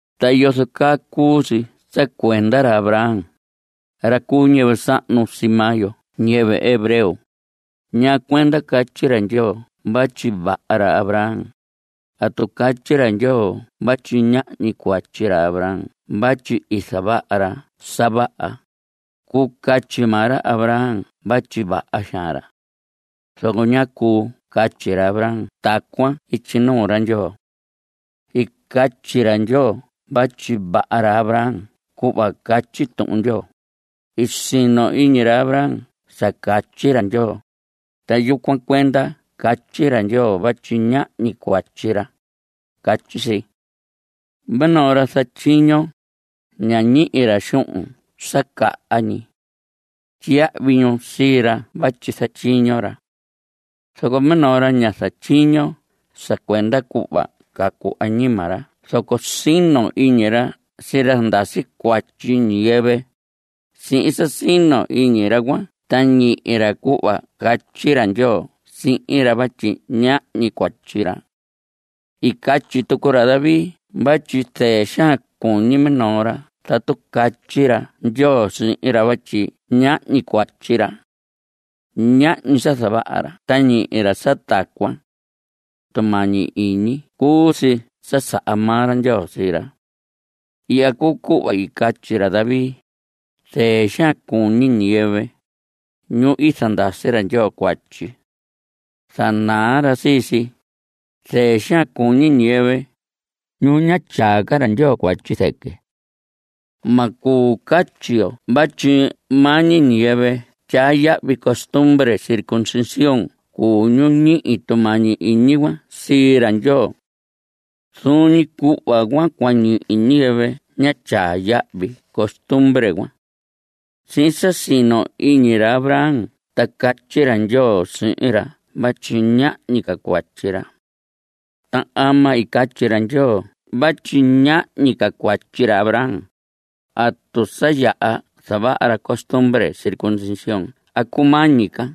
¿Ta yozo caa cuu si sa cuenda ra Abraham, ra cu ñiyɨvɨ sahnu sii maa yo ñiyɨvɨ hebreo? ¿Ñaa cuenda catyi ra Ndyoo vatyi vaha ra Abraham? Tatu catyi ra Ndyoo vatyi ñahñi cuatyi ra Abraham vatyi i zavaha ra sa vaha, cuu catyi maa ra Abraham vatyi vaha xaan ra. Zoco ñá cuu catyi ra Abraham tacuan ityi nuu ra Ndyoo. I catyi ra Ndyoo vatyi vaha ra Abraham cuhva catyi Tuhun Ndyoo: “I sino iñi ra Abraham sa catyi ra Ndyoo, ta yucuan cuenda catyi ra Ndyoo vatyi ñahñi cuatyi ra.” Catyi si. Minoo ra zatyiño, ña ñihi ra xuhun sa caha ñi. Tyiyahvi ñu sii ra vatyi zatyiño ra. Zoco minoo ra ña zatyiño sa cuenda cuhva cacu añima ra zoco sino iñi ra sii ra zandasi cuatyi ñiyɨvɨ, sihin sa sino ñi iñi ra cuan ta ñihi ra cuhva catyi ra Ndyoo sihin ra vatyi ñahñi cuatyi ra. I catyi tucu ra David vatyi zɨɨ xaan cuñi minoo ra tatu catyi ra Ndyoo sihin ra vatyi ñahñi cuatyi ra. Ñahñi sa zavaha ra ta ñihi ra sa tacuan. Tumañi iñi ñi cuu si sa saha maa ra Ndyoo sii ra. Ihya cuu cuhva i catyi ra David: Zɨɨ xaan cuñi ñiyɨvɨ, ñu i zandasi ra Ndyoo cuatyi. Zanaa ra sii si. Zɨɨ xaan cuñi ñiyɨvɨ, ñu ña tyaa ca ra Ndyoo cuatyi zɨquɨ. Ma cuu catyi yo vatyi maa ñi ñiyɨvɨ tyaa yahvi costumbre circuncisión cuu ñu ñihi tumañi iñi cuan sii ra Ndyoo. Zuun ñi cuhva cua ñihi ñiyɨvɨ ña tyaa yahvi costumbre cuan. Sihin sa sino ñi iñi ra Abraham ta catyi ra Ndyoo sihin ra vatyi ñahñi ca cuatyi ra. ¿Ta ama i catyi ra Ndyoo vatyi ñahñi cuatyi ra Abraham? ¿Atu sa yaha zavaha ra costumbre circuncisión a cumañi ca?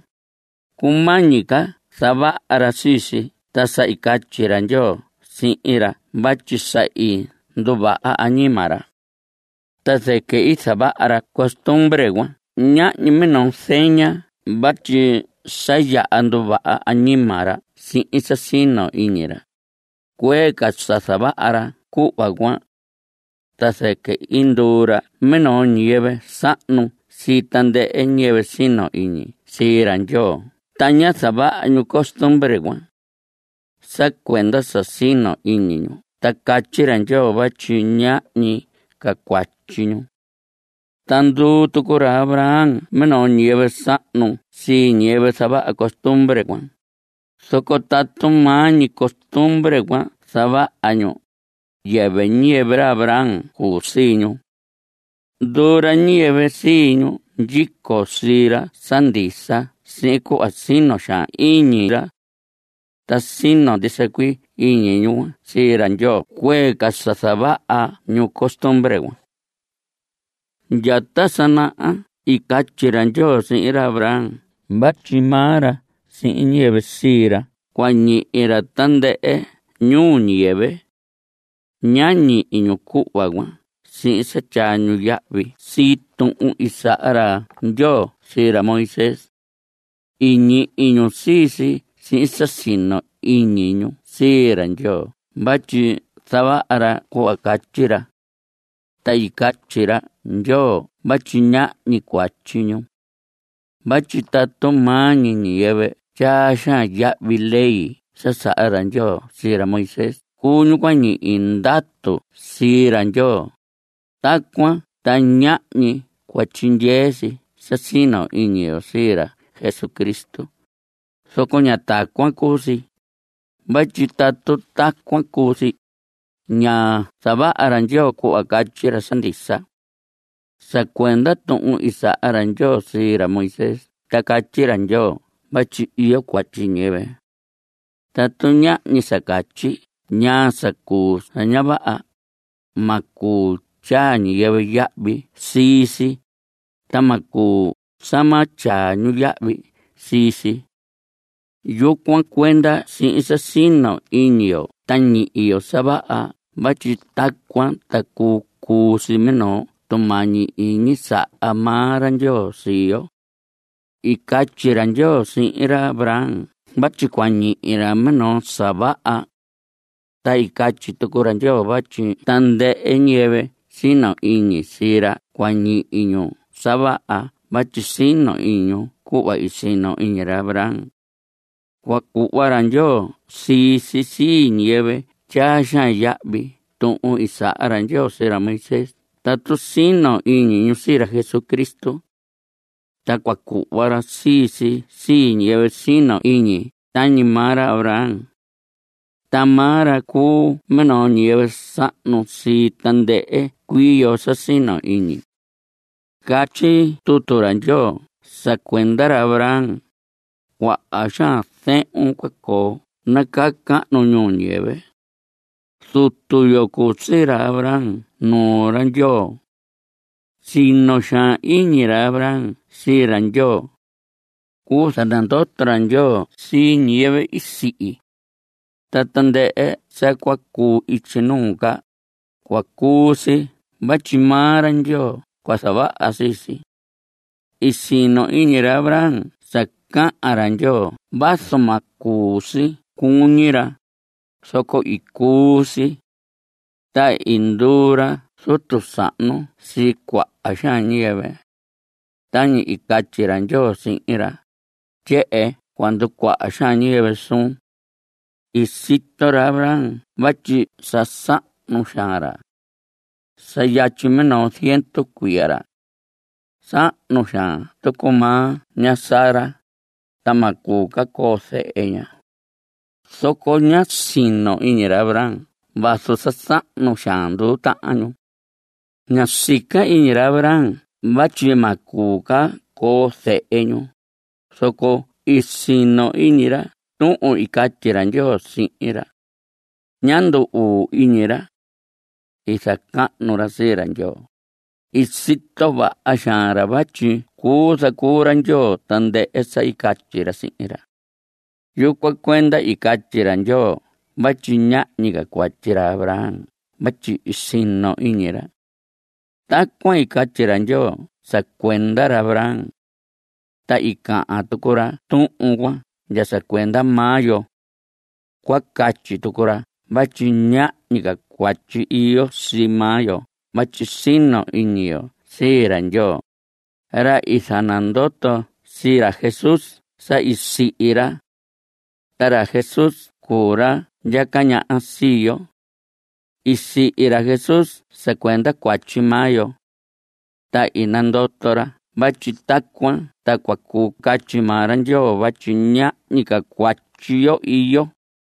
Cumañi ca zavaha ra sii si ta sa i catyi ra Ndyoo sihin ra vatyi sa i nduvaha añima ra. Ta zɨquɨ i zavaha ra costumbre cuan tañi minoo zeña vatyi sa yaha nduvaha añima ra sihin sa sino iñi ra, cuee ca sa zavaha ra cuhva cuan. Ta zɨquɨ i nduu ra minoo ñiyɨvɨ sahnu sii tandɨhɨ ñiyɨvɨ sino iñi sii ra Ndyoo ta ña zavaha ñu costumbre cuan. Sa cuenda sa sino ñi iñi ñu ta catyi ra Ndyoo vatyi ñahñi ca cuatyi ñu. Ta nduu tucu ra Abraham minoo ñiyɨvɨ sahnu sii ñiyɨvɨ zavaha costumbre cuan, zoco tatu maa ñi costumbre cuan zavaha ñu, yɨvɨ ñiyɨvɨ ra Abraham cuu sii ñu. Nduu ra ñiyɨvɨ sii ñu ndyico sii ra sa ndisa sihin cuhva sino xaan iñi ra. Ta sino ndisa cuii iñi ñu cuan sii ra Ndyoo cuee ca sa zavaha ñu costumbre cuan. Ndya ta sa naha i catyi ra Ndyoo sihin ra Abraham vatyi maa ra sihin ñiyɨvɨ sii ra cua ñihi ñu tandɨhɨ ñuu ñiyɨvɨ. Ñá ñihi ñu cuhva cuan sihin sa tyaa ñu yahvi sii tuhun i saha ra Ndyoo sii ra Moisés. I ñihi ñu sii si sihin sa sino ñi iñi ñu sii ra Ndyoo vatyi zavaha ra cuhva catyi ra. Ta i catyi ra Ndyoo vatyi ñahñi cuatyi ñu. Vatyi tatu maa ñi ñiyɨvɨ tyaa xaan yahvi ley sa saha ra Ndyoo sii ra Moisés cuu ñu cua ñihi ndatu sii ra Ndyoo, tacuan ta ñahñi cua tyindyee si sa sino iñi yo sii ra Jesucristo, zoco ña tacuan cuu si, vatyi tatu tacuan cuu si, ña zavaha ra Ndyoo cuhva catyi ra sa ndisa. Sa cuenda tuhun i saha ra Ndyoo sii ra Moisés ta catyi ra Ndyoo vatyi iyo cuatyi ñiyɨvɨ. Tatu ñahñi sa catyi ñaa sa cuu sa ña vaha, ma cuu tyaa ñiyɨvɨ yahvi sii si, ta ma cuu sa ma tyaa ñu yahvi sii si. Yucuan cuenda sihin sa sino ñi iñi yo ta ñihi yo sa vaha vatyi tacuan ta cuu cuu si minoo tumañi iñi saha maa ra Ndyoo sii yo. I catyi ra Ndyoo sihin ra Abraham vatyi cua ñihi ra minoo sa vaha. Ta i catyi tucu ra Ndyoo vatyi tandɨhɨ ñiyɨvɨ sino iñi sii ra cua ñihi ñu sa vaha vatyi sino iñi ñu cuhva i sino iñi ra Abraham. Cua cuhva ra Ndyoo sii si sii ñiyɨvɨ tyaa xaan yahvi tuhun i saha ra sii ra Moisés tatu sino iñi ñu sii ra Jesucristo. Ta cua cuhva ra sii si sii ñiyɨvɨ sino ñi iñi tañi maa ra Abraham. Ta maa ra cuu minoo ñiyɨvɨ sahnu sii tandɨhɨ cuii yo sa sino iñi. Catyi tutu ra Ndyoo sa cuenda ra Abraham: “Cuaha xaan zehun cua coo nacahnu ñuu ñiyɨvɨ.” Zutu yo cuu sii ra Abraham nuu ra Ndyoo. Sino xaan iñi ra Abraham sii ra Ndyoo. Cuu zanandoto ra Ndyoo sii ñiyɨvɨ i sihi. Ta tandɨhɨ sa cua cuu ityi nuu ca, cua cuu si vatyi maa ra Ndyoo cua zavaha sii si. I sino iñi ra Abraham sa cahan ra Ndyoo vazu ma cuu si cuñi ra, zoco i cuu si. Ta i nduu ra zutu sahnu sii cuaha xaan ñiyɨvɨ. Tañi i catyi ra Ndyoo sihin ra: “Tyehen cua nducuaha ñiyɨvɨ suun.” I sito ra Abraham vatyi sa sahnu xaan ra. Sa yatyi minoo ziendu cuiya ra. Sahnu xaan tucu maa ña Sara, ta ma cuu ca coo zehe ña. Zoco ña siin sino iñi ra Abraham vazu sa sahnu xaan nduu tahan ñu. Ñá sica iñi ra Abraham vatyi ma cuu ca coo zehe ñu, zoco i sino iñi ra tuhun i catyi ra Ndyoo sihin ra. Ñá ndu‑uu iñi ra. I zacahnu ra sii ra Ndyoo. I sito vaha xaan ra vatyi cuu zacuu ra Ndyoo tandɨhɨ sa i catyi ra sihin ra. Yucuan cuenda i catyi ra Ndyoo vatyi ñahñi cuatyi ra Abraham vatyi i sino iñi ra. Tacuan i catyi ra Ndyoo sa cuenda ra Abraham. Ta i cahan tucu ra tuhun cuan ndya sa cuenda maa yo. Cua catyi tucu ra vatyi ñahñi cuatyi iyo sii maa yo vatyi sino iñi yo sii ra Ndyoo, ra i zanandoto sii ra Jesús sa i sihi ra. Ta ra Jesús cuu ra ndyaca ñaha sii yo. I sihi ra Jesús sa cuenda cuatyi maa yo. Ta i nandoto ra vatyi tacuan ta cua cuu catyi maa ra Ndyoo vatyi ñahñi ca cuatyi yo iyo.